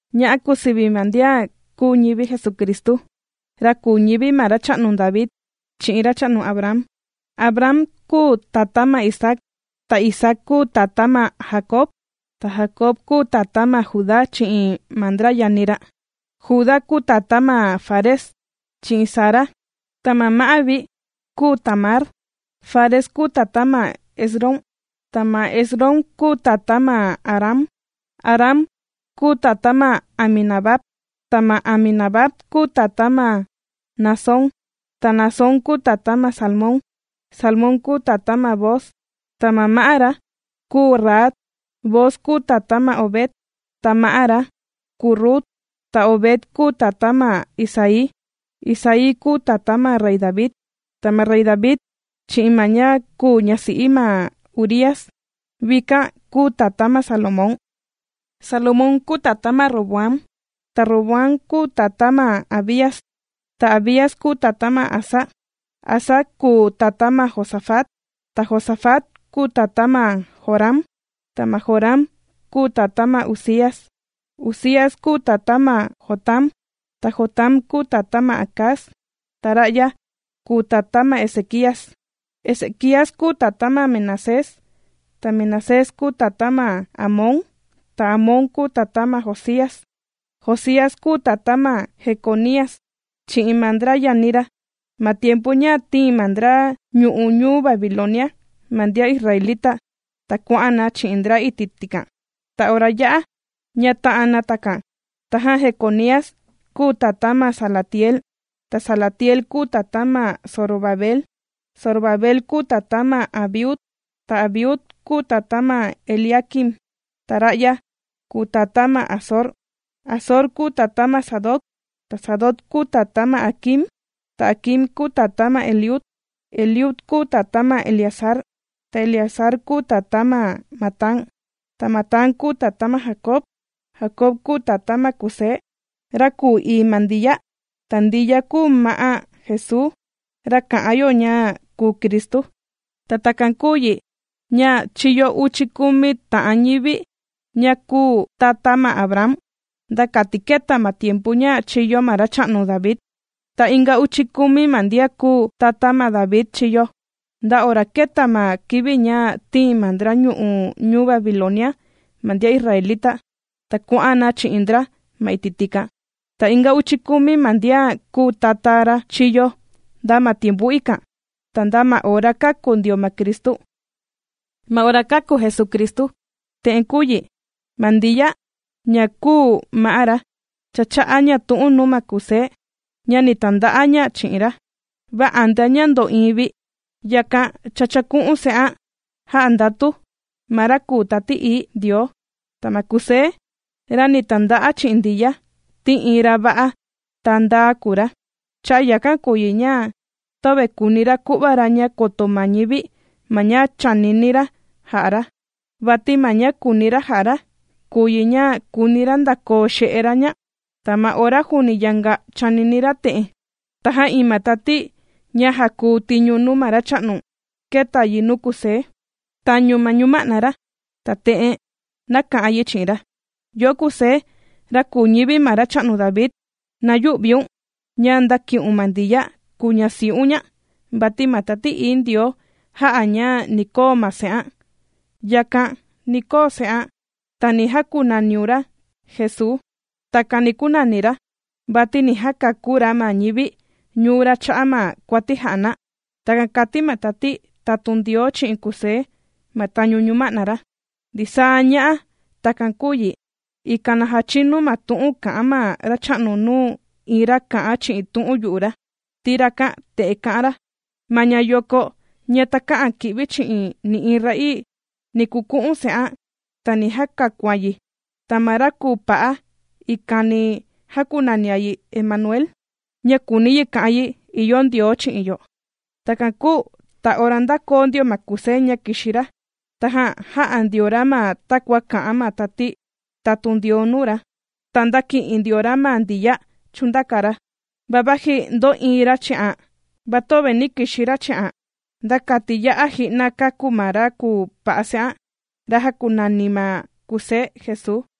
Ña'a kùu sivi ma ndian kūu ñivi Jesucristu, ra kūu ñivi ma racha'nu David, chi'in racha'nu Abraham. Abraham kūu tatá ma Isaac, ta Isaac kūu tatá ma Jacob, ta Jacob kūu tatá ma Judá chi'in ma ndra yani ra. Judá kūu tatá ma Fares, chi'in Zara, ta ma ma'á vi kūu Tamar. Fares kūu tatá ma Esrom, ta ma Esrom kūu tatá ma Aram. Aram kūu tatá ma Aminadab, ta ma Aminadab kūu tatá ma Naasón, ta Naasón kūu tatá ma Salmón. Salmón kūu tatá ma Booz, ta ma ma'á ra kūu Rahab. Booz kūu tatá ma Obed, ta ma ma'á ra kūu Rut. Ta Obed kūu tatá ma Isaí. Isaí kūu tatá ma rey David. Ta ma rey David chi'in ma ña kūu ñasi'i ma Urías, vikan kūu tatá ma Salomón. Salomón kūu tatá ma Roboam, ta Roboam kūu tatá ma Abías, ta Abías kūu tatá ma Asa. Asa kūu tatá ma Josafat, ta Josafat kūu tatá ma Joram, ta ma Joram kūu tatá ma Uzías. Uzías kūu tatá ma Jotam, ta Jotam kūu tatá ma Acaz, ta ra'ya kūu tatá ma Ezequías. Ezequías kūu tatá ma Manasés, ta Manasés kūu tatá ma Amón, ta Amón kūu tatá ma Josías. Josías kūu tatá ma Jeconías chi'in ma ndra yani ra, ma tiempu ña tīin ma ndra ñu'u' ñuu Babilonia ma ndian israelita, ta kuà'an na chi'in ndra iti' tikan. Ta ora yā'a, ña tā'an na takan, tajan Jeconías kūu tatá ma Salatiel, ta Salatiel kūu tatá ma Zorobabel. Zorobabel kūu tatá ma Abiud, ta Abiud kūu tatá ma Eliaquim, ta ra'ya kūu tatá ma Azor. Azor kūu tatá ma Sadoc, ta Sadoc kūu tatá ma Aquim, ta Aquim kūu tatá ma Eliud. Eliud kūu tatá ma Eleazar, ta Eleazar kūu tatá ma Matán, ta Matán kūu tatá ma Jacob. Jacob kūu tatá ma Kusé, ra kùu ii ma Ndiya, ta Ndiya kūu ma'á Jesuu, ra kà'an yo ña kùu Cristu. Ta takan kūu yi ña, chīyo uchi kumi ta'an ñivi ña kùu tata ma Abraham, nda kati kēta ma tiempu ña chīyo ma racha'nu David. Ta inga uchi kumi ma ndian kùu tata ma David chīyo, nda ora kēta ma kivi ña tīin ma ndra ñu'u' ñuu Babilonia ma ndian israelita, ta kuà'an na chi'in ndra ma iti' tikan. Ta inga uchi kumi ma ndian kùu tata ra chīyo, nda ma tiempu ikan, ta nda ma ora kāku ndio ma Cristu. Ma ora kāku Jesucristu, te'en kūu yi: ma Ndiya ña kūu ma'á ra, cha chā'a ña tu'un nuu ma Kusé, ña ni tanda'a ña chi'in ra. Va antea ña ndò'iin vi, yakan cha chāku'un se'an jā'a ndatu ma Ra kùu Tati Ií Ndioo. Ta ma Kusé, ra ni tanda'a chi'in Ndiya, ti iin ra va'a, ta ndaa kùu ra. Cha'a' yakan kùu yi ña, töve kùuni ra ku'va ra ña koto ma ñivi ma ña chànini ra ja'a ra. Vati ma ña kùuni ra ja'a ra, kùu yi ña, kùuni ra ndakoo xe'e ra ña. Ta ma ora juuni yanga chànini ra te'en, tajan iin ma tati ña jàkuu tiñu nuu ma Racha'nu, kēta yi nuu Kusé tañu ñuma'na ra, ta te'en nāka'an yi chi'in ra: ―Yo'o Kusé, ra kùu ñivi ma racha'nu David, na yü'viun ña ndàki'un ma Ndiya kùu ñasi'un ña, vati ma Tati Ií Ndioo jā'a ña ni koo ma se'an. Yakan, ni koo se'an, ta ni jakunaniun ra, Jesuu. Takan ni kunani ra, vati ni jakakú ra ma ñivi ñuu ra cha'a' ma kuati jà'a na. ―Takan kàti ma tati tatun Ndioo chi'in Kusé ma tañu ñuma'na ra. Ndisaa ña'a takan kūu yi, ikan na jachinu ma tu'un kā'an ma Racha'nu nuu iin ra kā'an chi'in tu'un yu'u ra, ti rakan te'en kā'an ra: Ma ñayoko ña takä'an kì'vi chi'in nï'iin ra'ii, ni kuku'un se'an, ta ni jakakuan yi, ta ma ra kùu pa'a ikan ni jakunani na yi Emanuel, ña kùuni yi ka'an yi: ìyo Ndioo chi'in yo. Takan kūu ta ora ndākoo ndio ma Kusé ña kìxi ra, tajan jā'a ndio ra ma takua kā'an ma tati tatun Ndioo nuu ra, ta ndāki'in ndio ra ma Ndiya chūndaka ra. Va vaji ndō'iin ra chi'an, va töve nī kixi ra chi'an, nda kati ya'a ji'na kāku ma ra kùu pa'a se'an, ra jākunani ma Kusé, Jesuu.